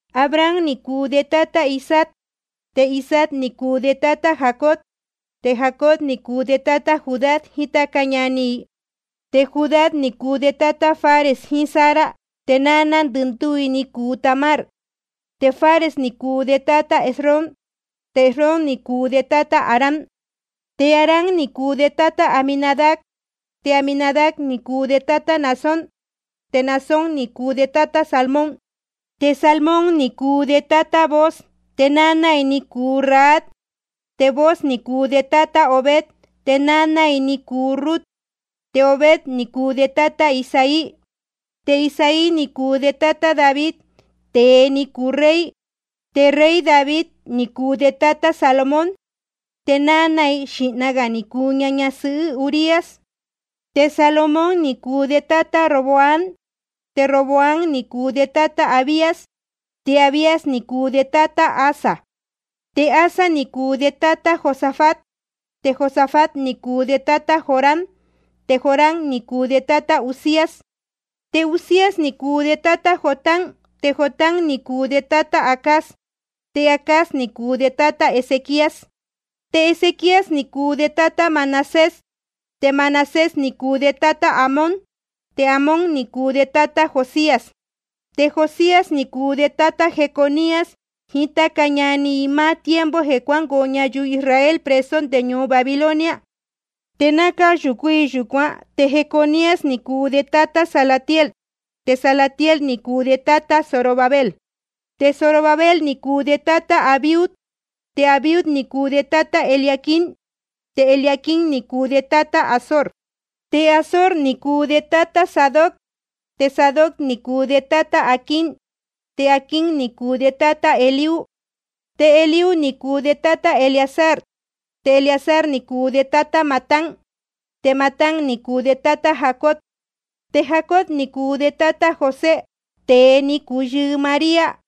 Abraham ni cuu de tátá Isaac, te Isaac ni cuu de tátá Jacob, te Jacob ni cuu de tátá Judá jiín táca ñani i. Te Judá ni cuu de tátá Fares jiín Zara, te náná ndɨndúú i ni cuu Tamar. Te Fares ni cuu de tátá Esrom, te Esrom ni cuu de tátá Aram. Te Aram ni cuu de tátá Aminadab, te Aminadab ni cuu de tátá Naasón, te Naasón ni cuu de tátá Salmón. Te Salmón ni cuu de tátá Booz, te náná i ni cuu Rahab. Te Booz ni cuu de tátá Obed, te náná i ni cuu Rut. Te Obed ni cuu de tátá Isaí. Te Isaí ni cuu de tátá David, tēe ni cuu rey. Te rey David ni cuu de tátá Salomón, te náná i, xīhna gā ni cuu ña ñasɨhɨ́ Urías. Te Salomón ni cuu de tátá Roboam, te Roboam ni cuu de tátá Abías, te Abías ni cuu de tátá Asa. Te Asa ni cuu de tátá Josafat, te Josafat ni cuu de tátá Joram, te Joram ni cuu de tátá Uzías. Te Uzías ni cuu de tátá Jotam, te Jotam ni cuu de tátá Acaz, te Acaz ni cuu de tátá Ezequías. Te Ezequías ni cuu de tátá Manasés, te Manasés ni cuu de tátá Amón, te Amón ni cuu de tátá Josías. Te Josías ni cuu de tátá Jeconías jiín táca ñani i, máá tiempo jeē cuángoo ñayuu Israel preso nde ñuu Babilonia. Te náa cáyūcú i yūcuán, te Jeconías ni cuu de tátá Salatiel. Te Salatiel ni cuu de tátá Zorobabel. Te Zorobabel ni cuu de tátá Abiud, te Abiud ni cuu de tátá Eliaquim, te Eliaquim ni cuu de tátá Azor. Te Azor ni cuu de tátá Sadoc, te Sadoc ni cuu de tátá Aquim, te Aquim ni cuu de tátá Eliud. Te Eliud ni cuu de tátá Eleazar, te Eleazar ni cuu de tátá Matán, te Matán ni cuu de tátá Jacob. Te Jacob ni cuu de tátá José, tēe ni cuu yɨɨ María.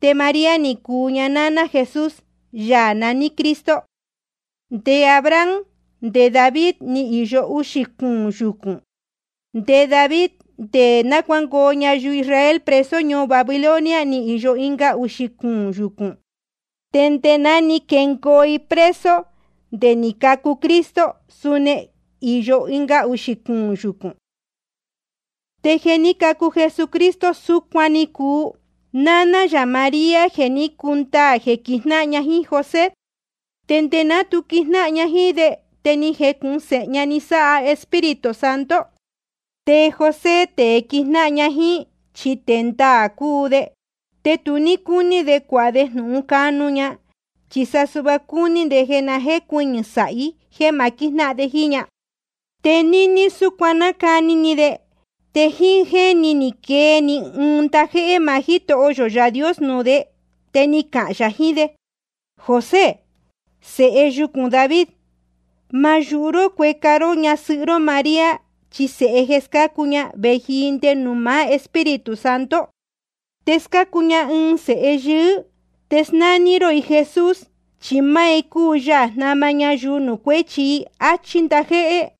Te María ni cuu ña náná Jesús, Yaā naní Cristo. Te nde Abraham te nde David ni īyo uxī cuūn yucūn. Te nde David te nde náa cuangoo ñayuu Israel preso ñuu Babilonia ni īyo ɨnga uxī cuūn yucūn. Te nde ná ni jengoo i preso te nde ni cacu Cristo, suni ni īyo ɨnga uxī cuūn yucūn. Te jeē ní cacu Jesucristo, súcuan ni cuu: Náná yā María, je ni cundaā jeē quijnáhan ña jíín José. Te nde ná tu quijnáhan ña jíín de, te ni jecūhun séhe ña ni sáha Espíritu Santo. Te José, tēe quijnáhan ña jíín, chi tēe ndaā cúu de. Te tu ní cúní de cuāha de jnūhun canu ña, chi sa cúní de jeē na jécuɨñɨ̄ sāhi jéē ma quíjnáhan de jíín ña. Te níní súcuan nácani ni de, te jíín jéni ni quee‑ni ɨɨn ndajéhé maá Jítoho yō Yaā Dios nuū de, te ni cahān yā jiín de: José, sēhe yucūn David, ma yūhu ró cueca ró ñasɨhɨ́ ró María, chi sēhe jeē scácu ña, vēji i nde nuū maá Espíritu Santo. Te scácu ña ɨɨn sēhe yɨɨ́. Te snání ró i Jesús, chi máá i cúu Yaā jnama ñayuu nuū cuéchi i, áchí ndajéhé.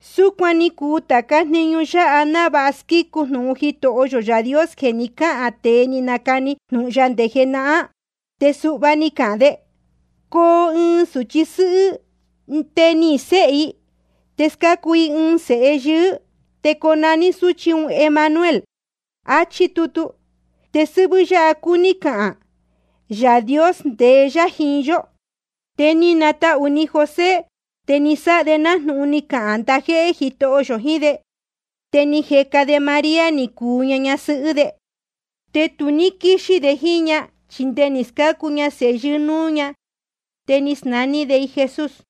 Súcuan ni cuu tācá jniñu yáha, návāha squícu jnūhun Jitoho yō Yaā Dios jeē ni cáhān tēe ni nacani jnūhun ya nde jenahán. Te suhva ni cahān de: Coo ɨɨn sūchi sɨ́hɨ́, te nihīn séhe i, te scácu i ɨɨn sēhe yɨɨ́, te conaní sūchí un Emanuel. Achí tutu. Te sɨ́hvɨ́ yáha cúní cahān: Yaā Dios ndeé yá jiín yó. Te ni natahū ni José, te ni sáha de nájnūhun ni cahān ndajéhé Jitoho yō jiín de. Te ni jeca de María ni cuu ña ñasɨhɨ́ de. Te tu ní quíxí de jíín ña, chi nde ni scácu ña sēhe yɨɨ́ núú ña. Te ni snaní de i Jesús.